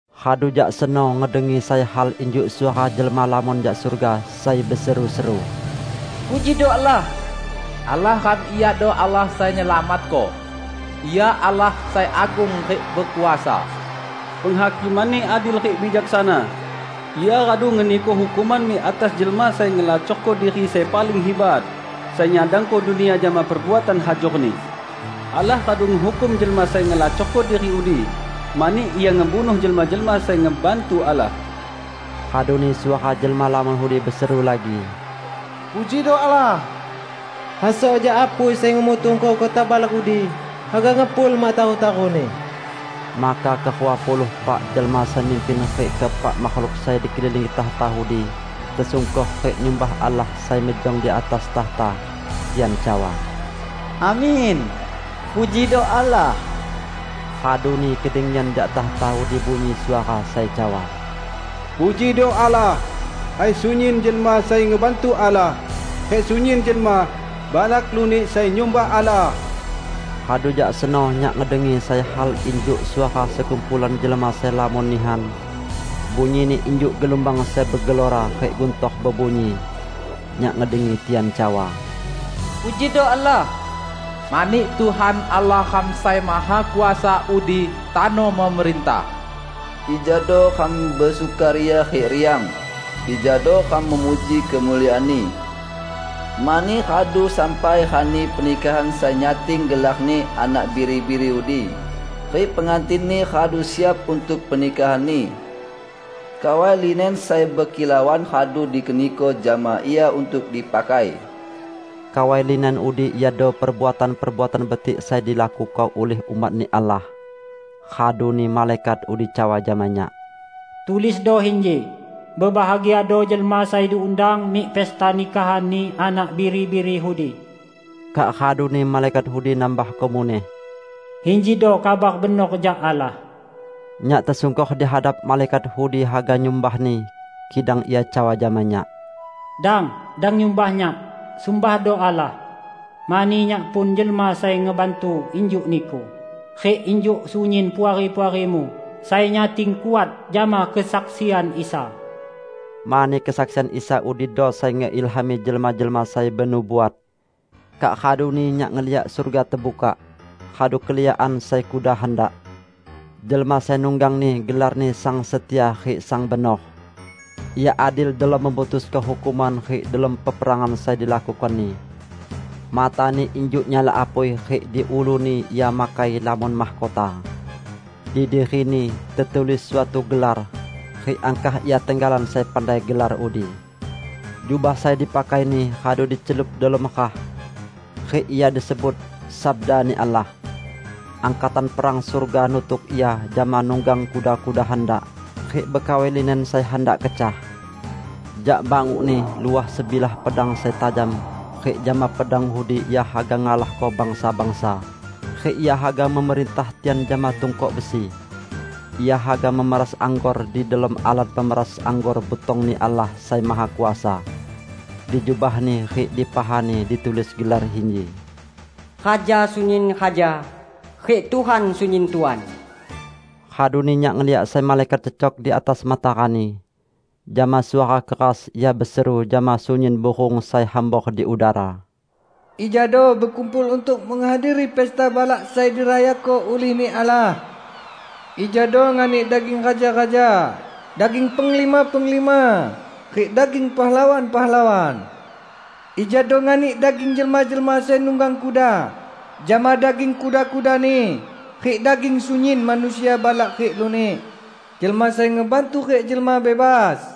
Radu jak seno ngedengi sai hal injuk suara jelma lamon jak surga sai beseru-seru, "Pujido Allah! Allah ram iado Allah sai nyelamatko; Ia Allah sai agung rik bekuasa! Penghakiman-Ni adil rik bijaksana! Ia radu ngeniko hukuman mik atas jelma sai ngelacorko diri sai paling hibat, sai nyadangko dunia jama perbuatan hajorni. Allah radu ngehukum jelma sai ngelacorko diri udi, mani ia ngebunuh jelma-jelma sai ngebantu Allah." Raduni suara jelma lamon udi beseru lagi, "Pujido Allah! Hasok jak apui sai ngemutungko kota balak udi haga ngepul mak taru-taruni!" Maka kerua puluh epak jelma sai mimpin rik keepak makhluk sai dikelilingi takhta udi tesungkor rik nyumbah Allah sai mejong di atas takhta. Tian cawa, "Amin! Pujido Allah!" Raduni kedengian jak takhta udi bunyi suara sai cawa, "Pujido Allah, hai sunyin jelma sai ngebantu Allah, rik sunyin jelma -- balak lunik -- sai nyumbah Allah!" Radu jak seno nyak ngedengi sai hal injuk suara sekumpulan jelma sai lamon nihan; bunyini injuk gelumbang sai begelora rik guntor bebunyi. Nyak ngedengi tian cawa, "Pujido Allah! Mani Tuhan, Allah ram Sai Mahakuasa udi tano memerintah! Ijado ram besukaria rik riang, ijado ram memuji kemuliaan-Ni! Mani radu sampai rani pernikahan sai nyating gelar-Ni Anak Biri-biri udi, rik pengantin-Ni radu siap untuk pernikahan-Ni. Kawai linen sai bekilauan radu dikeniko jama ia untuk dipakai." (Kawai linen udi iado perbuatan-perbuatan betik sai dilakuko ulih umat-Ni Allah.) Raduni malaikat udi cawa jama nyak, "Tulisdo inji: 'Bebahagiado jelma sai diundang mik pesta nikahan-Ni Anak Biri-biri udi.' " Kak raduni malaikat udi nambahko muneh, "Injido kabar benor jak Allah." Nyak tesungkor di hadap malaikat udi haga nyumbahni, kidang ia cawa jama nyak, "Dang! Dang nyumbah nyak, sumbahdo Allah! Mani nyak pun jelma sai ngebantu injuk niku rik injuk sunyin puari-puarimu sai nyating kuat jama kesaksian Isa!" Mani kesaksian Isa udido sai ngeilhami jelma-jelma sai benubuat. Kak raduni nyak ngeliak surga tebukak, radu keliakan sai kuda handak. Jelma sai nunggang-Ni gelarni Sang Setia rik Sang Benor. Ia adil delom memutusko hukuman rik delom peperangan sai dilakuko-Ni. Mata-Ni injuk nyala apui rik di ulu-Ni ia makai lamon mahkota. Di diri-Ni tetulis suatu gelar; rik angkah ia tenggalan sai pandai gelar udi. Jubah sai dipakai-Ni radu dicelup delom rah. Rik Ia disebut "Sabda-Ni Allah". Angkatan perang surga nutuk Ia jama nunggang kuda-kuda handak, rik bekawai linen sai handak kecah. Jak banguk-Ni luah sebilah pedang sai tajam rik jama pedang udi Ia haga ngalahko bangsa-bangsa, rik Ia haga memerintah tian jama tungkok besi. Ia haga memeras anggor di delom alat pemeras anggor butong-Ni Allah Sai Mahakuasa. Di jubah-Ni rik di paha-Ni ditulis gelar inji, "Raja sunyin raja, rik Tuhan sunyin tuan." Raduni nyak ngeliak sai malaikat cecok di atas matarani. Jama suara keras ia beseru jama sunyin burung sai hambor di udara, "Ijado bekumpul untuk menghadiri pesta balak sai dirayako ulih-Ni Allah! Ijado nganik daging raja-raja, daging penglima-penglima, rik daging pahlawan-pahlawan; ijado nganik daging jelma-jelma sai nunggang kuda jama daging kuda-kudani rik daging sunyin manusia balak rik lunik, jelma sai ngebantu rik jelma bebas!"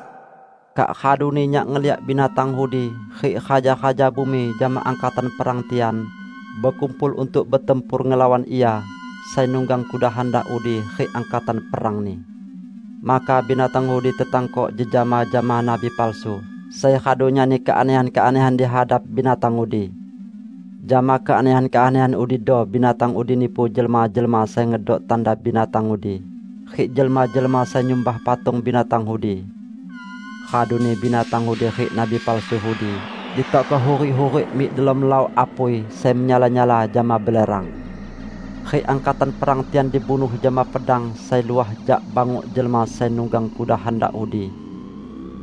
Kak raduni nyak ngeliak binatang udi, rik raja-raja bumi jama angkatan perang tian, bekumpul untuk betempur ngelawan Ia sai nunggang kuda handak udi rik angkatan perang-Ni. Maka binatang udi tetangkok jejama jama nabi palsu sai radu nyani keanehan-keanehan di hadap binatang udi. (Jama keanehan-keanehan udido binatang udi nipu jelma-jelma sai ngedok tanda binatang udi, rik jelma-jelma sai nyumbah patung binatang udi.) Raduni binatang udi rik nabi palsu udi ditokko hurik-hurik mik delom laok apui sai menyala-nyala jama belerang. Rik angkatan perang tian dibunuh jama pedang sai luah jak banguk jelma sai nunggang kuda handak udi.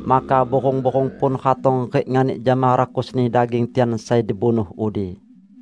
Maka burung-burung pun ratong rik nganik jama rakusni daging tian sai dibunuh udi.